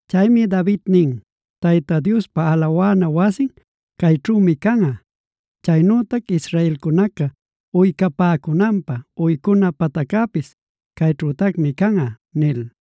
Chaymi David nin: “Tayta Diospa alawana wasin cayćhümi canꞌa; chaynütac israelcunaca uycapäcunanpä uycuna pataccäpis cayćhütacmi canꞌa” nil.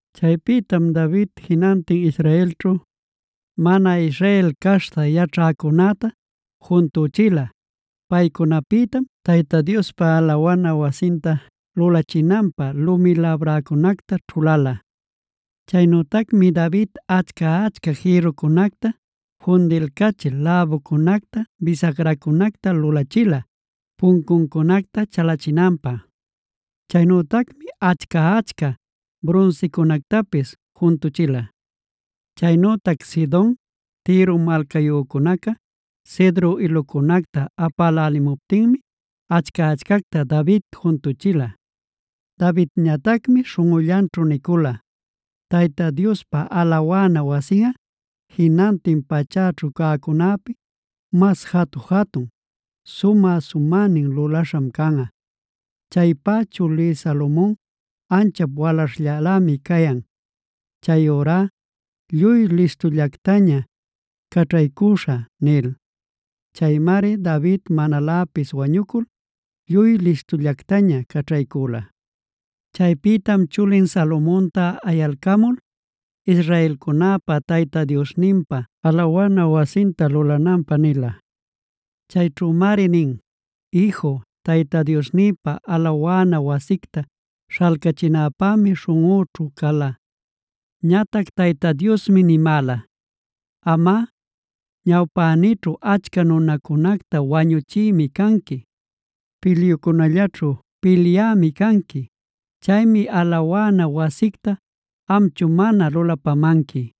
Chaypïtam David jinantin Israelćhu, mana Israel caśhta yaćhäcunäta juntüchila. Paycunapïtam Tayta Diospa alawana wasinta lulachinanpä lumi labräcunacta ćhulala. Chaynütacmi David achca-achca jïrrucunacta fundilcachil läbucunacta, bisagracunacta lulachila puncuncunacta chalachinanpä. Chaynütacmi achca-achca brunsicunactapis juntuchila. Chaynütac Sidon, Tiro malcayücunaca cedro ilucunacta apälälimuptinmi achca-achcacta David juntuchila. Davidñatacmi śhunꞌullanćhu nicula: “Tayta Diospa alawana wasinꞌa jinantin pachäćhu cäcunäpi mas jatu-jatun, sumä-sumänin lulaśham canꞌa. Chaypá chulí Salomon anchap walaśhllalämi cayan. Chayurá lluy listullactaña caćhaycüśhä” nil. Chaymari David manaläpis wañucul lluy listullactaña caćhaycüla. Chaypïtam chulin Salomonta ayalcamul, israelcunäpa Tayta Diosninpa alawana wasinta lulananpä nila. Chayćhümari nin: “Iju, Tayta Diosnïpa alawana wasicta śhalcachinäpämi śhunꞌüćhu cala. Ñatac Tayta Diosmi nimäla: ‘Amꞌa, ñawpänïćhu achca nunacunacta wañuchïmi canqui; pilyucunallaćhu pilyämi canqui. Chaymi alawana wasicta amchu mana lulapamanqui.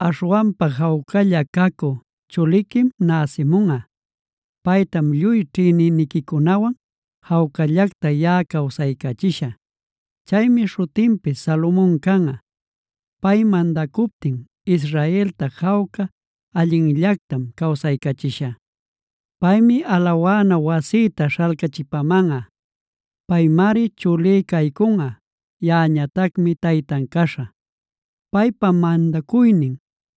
Aśhwanpa jawcalla cacü chuliquim näsimunꞌa. Paytam lluy ćhïnicünincunawan jawcallacta yaꞌa cawsaycachishä. Chaymi śhutinpis Salomona canꞌa. Pay mandacuptin, Israelta jawca allinllactam cawsaycachishä. Paymi alawana wasïta śhalcachipamanꞌa. Paymari chulí caycunꞌa; yaꞌañatacmi taytan caśhä. Paypa mandacuynin,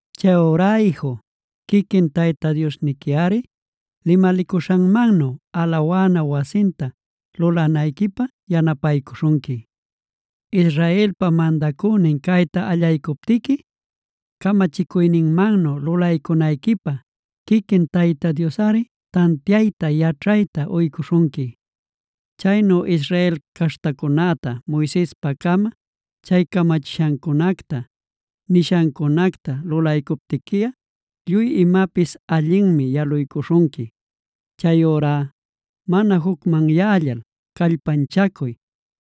“Chayurá iju, quiquin Tayta Diosniquiꞌari limalicuśhanmannu alawana wasinta lulanayquipä yanapaycuśhunqui. Israelpa mandacünin cayta allaycuptiqui, camachicuyninmannu lulaycunayquipä quiquin Tayta Diosꞌari tantiayta, yaćhayta uycuśhunqui. Chaynu Israel caśhtacunäta Moisespa-cama chay camachishancunacta, nishancunacta lulaycuptiquiꞌa lluy imapis allinmi yaluycuśhunqui. Chayurá mana jucmanyällal callpanchacuy.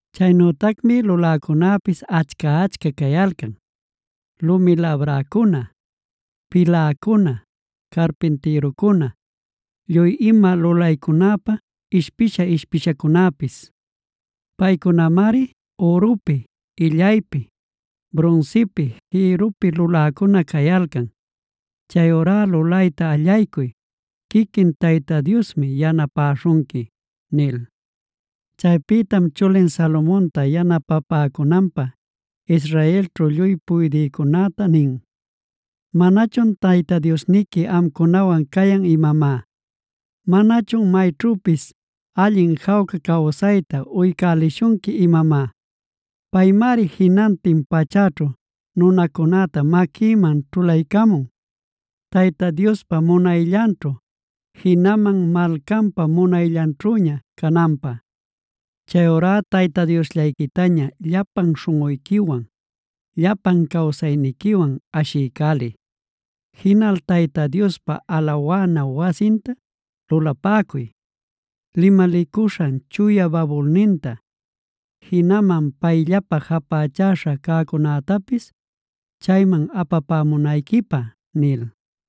Chaynütacmi luläcunapis achca-achca cayalcan: lumi labräcuna, piläcuna, carpintïrucuna, lluy ima lulaycunapä ishpisha-ishpishacunapis. Paycunamari ürupi, illaypi, brunsipi, jïrrupi luläcuna cayalcan. Chayurá lulayta allaycuy; quiquin Tayta Diosmi yanapäśhunqui” nil. Chaypïtam chulin Salomonta yanapapäcunanpä, israelćhu lluy puydïcunäta nin: “¿¡Manachun Tayta Diosniqui amcunawan cayan imamá!? ¿¡Manachun mayćhüpis allin jawca cawsayta uycälishunqui imamá!? Paymari jinantin pachäćhu nunacunäta maquïman ćhulaycamun, Tayta Diospa munayllanćhu jinaman malcanpa munayllanćhüña cananpä. Chayurá Tayta Diosllayquitaña llapan śhunꞌuyquiwan, llapan cawsayniquiwan ashiycäliy. Jinal Tayta Diospa alawana wasinta lulapäcuy, limalicuśhan chuya babulninta, jinaman payllapa japächäśha cäcunätapis chayman apapämunayquipä” nil.